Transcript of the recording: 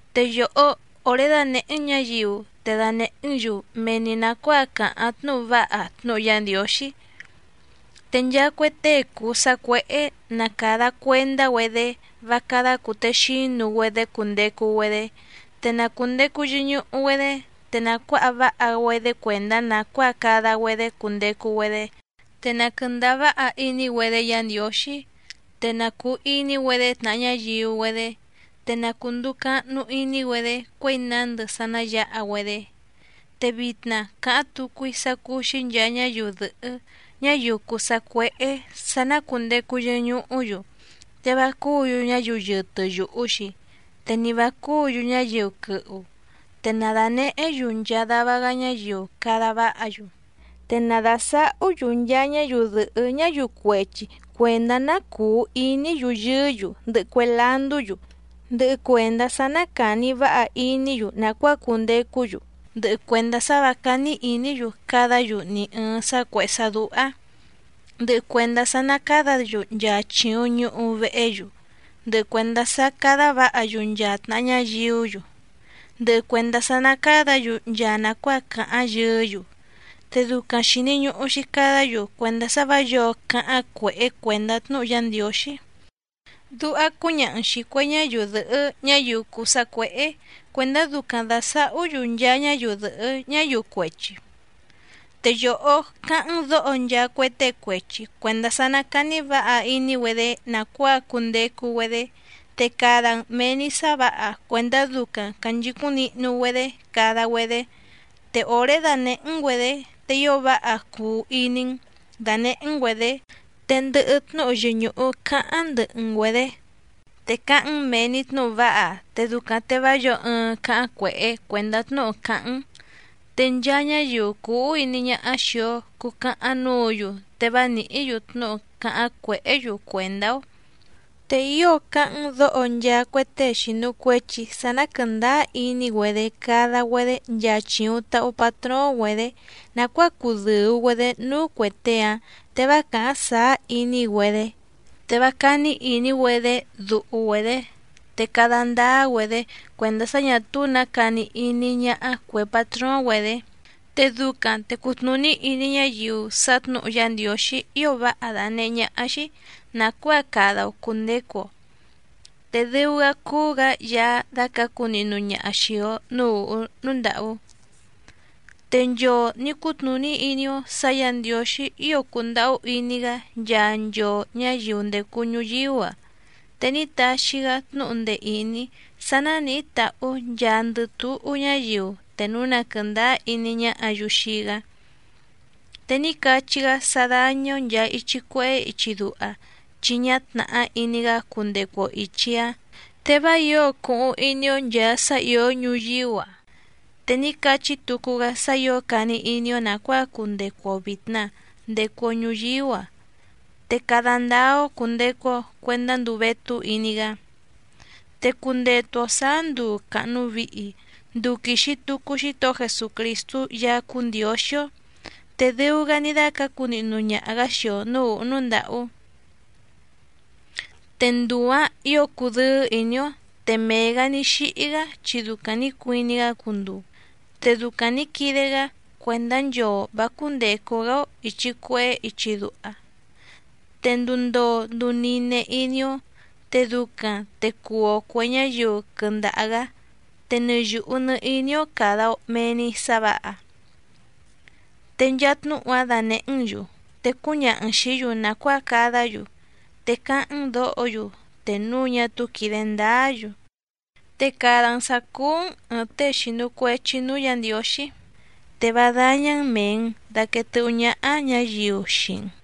Te yòhó òré dánèhé‑n ñǎyiu, te danèhé‑n‑yu mee‑ni nàcuáa càháⁿ tnúhu váha tnúhu Yá Ndiǒxí. Te nchaa cue tée cùu sacuéhé ná càda cuendá‑güedé vá cádá cùtexínu‑güedé cundecu‑güedé, te na cùndecu yɨñuhu‑güedé, te na cuǎha váha‑güedé cuèndá nàcuáa cada‑güedé cundecu‑güedé, te na quɨ̀ndáá váha iní‑güedé Yǎ Ndiǒxí, te na cùu iní‑güedé tnàha ñáyiu‑güedé, te na cùnduu cahnu iní‑güedé cuěi nándɨ sá ná yǎha‑güedé. Te vitna càháⁿ tucu‑í sá cúú‑xí nchàa ñáyiu dɨ̀hɨ́ ñáyiu cùu sacuéhé sǎ ná cùndecu yɨñuhú‑yu, te vá cúǔ‑yu ñáyiu yɨtɨ yùhu‑xi, te ni vǎ cúǔ‑yu ñáyiu quɨhu, te na dànehé‑yu nchaa dava‑gá ñáyiu cada váha‑yu. Te na dàsahú‑yu nchaa ñáyiu dɨ̀hɨ́ ñáyiu cuechi cuèndá ná cùu iní‑yu yɨɨ́‑yu, ndɨhɨ cue landú‑yu, ndɨhɨ cuèndá sá ná càni váha iní‑yu nàcuáa cundecú‑yu, ndɨhɨ cuèndá sá vǎ cání ìní‑yu cadá‑yu ni ɨ̀ɨⁿ sá cuèhé sá dúhá, ndɨhɨ cuèndá sá ná càdá‑yu nchaa chìuⁿ ñuhu vehé‑yu, ndɨhɨ cuèndá sá cádá vǎha‑yu nchaa tnàha ñáyiú‑yu, ndɨhɨ cuèndá sá ná cádǎ‑yu nchaa nàcuáa càháⁿ yɨɨ́‑yu, te ducaⁿ xìni ñuhu‑xi cadá‑yu cuèndá sá vǎ yǒo cáháⁿ cuèhé cuèndá tnúhu Yá Ndiǒxí. Duha cúñaha‑n xìi cue ñáyiu dɨ̀hɨ́ ñáyiu cùu sacuéhé cuèndá ducaⁿ dàsahú‑yu nchaa ñáyiu dɨ̀hɨ́ ñáyiu cuechi. Te yòhó cáháⁿ‑n dǒho nchaa cue tée cuechi cuèndá sá ná càni váha iní‑güedé nàcuáa cundecu‑güedé, te cada‑n mèe‑ni sá vǎha cuèndá ducaⁿ cànchicúⁿ nihnu‑güedé cada‑güedé, te òré danèhé‑n‑güedě te ío váha cuu iní‑n dànehé‑n‑güedě, te ndɨhɨ tnúhu yɨñùhu cáháⁿ ndɨhɨ‑n‑güedě. Te cáháⁿ‑n mèe‑ni tnúhu váha, te ducaⁿ te vá yǒo ɨɨⁿ cáháⁿ cuèhé cuèndá tnúhu càháⁿ‑n, te nchaa ñáyiu cùu úhú iní ñáhá xìi‑o cucahaⁿ núǔ‑yu, te vá nìhí‑yu tnúhu cáháⁿ cuèhé‑yu cuèndá‑ó. Te ío cáháⁿ‑n dǒho nchaa cue tée xìnu cuechi sá ná quɨ̀ndáá iní‑güedé cada‑güedé nchaa chìuⁿ tahu patróóⁿ‑güedě nàcuáa cudɨ̀u‑güedé núú cuè tée‑áⁿ, te vá càháⁿ sàá iní‑güedé. Te vá cání ìní‑güedé duhu‑güedě, te cada ndáá‑güedé cuèndá sá ñà túú nǎ cani iní ñáhá cuè patróóⁿ‑güedě, te ducaⁿ te cutnùní iní ñáyiu sá tnǔhu Yá Ndiǒxí ío váha dànehé ñáhá‑xí nàcuáa cada‑o cùndecu‑o, te dɨu‑gá cúú‑gǎ Yaá dácǎcu nihnu ñaha xìi‑o núú ùhú núú ndàhú. Te nchoo nǐ cutnùní iní‑ó sǎ Yǎ Ndiǒxí ío cùndahú iní‑gá nchaa nchoo ñǎyiu ndècu ñuyíú‑a, te ní taxi‑gá tnúhu ndee ìní sá nánìhí tàhú nchaandɨ túhú ñáyiu te núu na quɨ̀ndáá iní ñáhǎ‑yu xii‑gá. Te ní cachí‑gá sá dáñá‑ó nchàa ichi cuehé ichi duha chi ñá tnàhá iní‑gá cundecu‑o ìchi‑áⁿ, te vá ǐo cuhuⁿ iní‑ó nchàa sá ìó ñuyíú‑a, te ní cachí tucu‑gá sá ǐo cani iní‑ó nàcuáa cundecu‑o vìtna ndecu‑o ñuyíú‑a te cada ndáá‑ó cùndecu‑o cuendá nduu vétú iní‑gá. Te cundetu‑o sǎá nduu càhnu vihi, nduu quìxi tucu Xítohó Jesucrìstú Yaá cúú Ndiǒxí‑ó, te dɨu‑gá ní dácǎcu nihnu ñaha‑gǎ xii‑o nǔú ùhú núú ndàhú. Te nduu‑ǎⁿ ǐo cudɨ́ɨ́ ìní‑ó. Te mee‑gǎ ní xíhí‑gá chi ducaⁿ nǐ cuiní‑gá cunduu, te ducaⁿ nǐ quide‑gá cuèndá nchoo vǎ cúndècu‑gá‑ó ìchi cuehé ichi duha, te nduu ndoo nduu nine iní‑ó, te ducaⁿ te cuu‑o cuè ñáyiu quɨndaha‑gǎ, te nɨ yùhu nɨ iní‑ó càda‑o mee‑ni sá vǎha. Te nchaa tnúhu‑áⁿ danèhé‑n‑yu te cúñaha‑n xìí‑yu nàcuáa cadá‑yu, te cáháⁿ‑n dǒho‑yu te núu ñá túú quìde ndáá‑yu. Te cada‑n sǎ cúú‑n ɨ̀ɨⁿ tée xìnu cuechi núú Yǎ Ndiǒxí, te vá dáñá‑n mèe‑n daquee tɨ́hú ñáhá ñǎyiu xii‑n.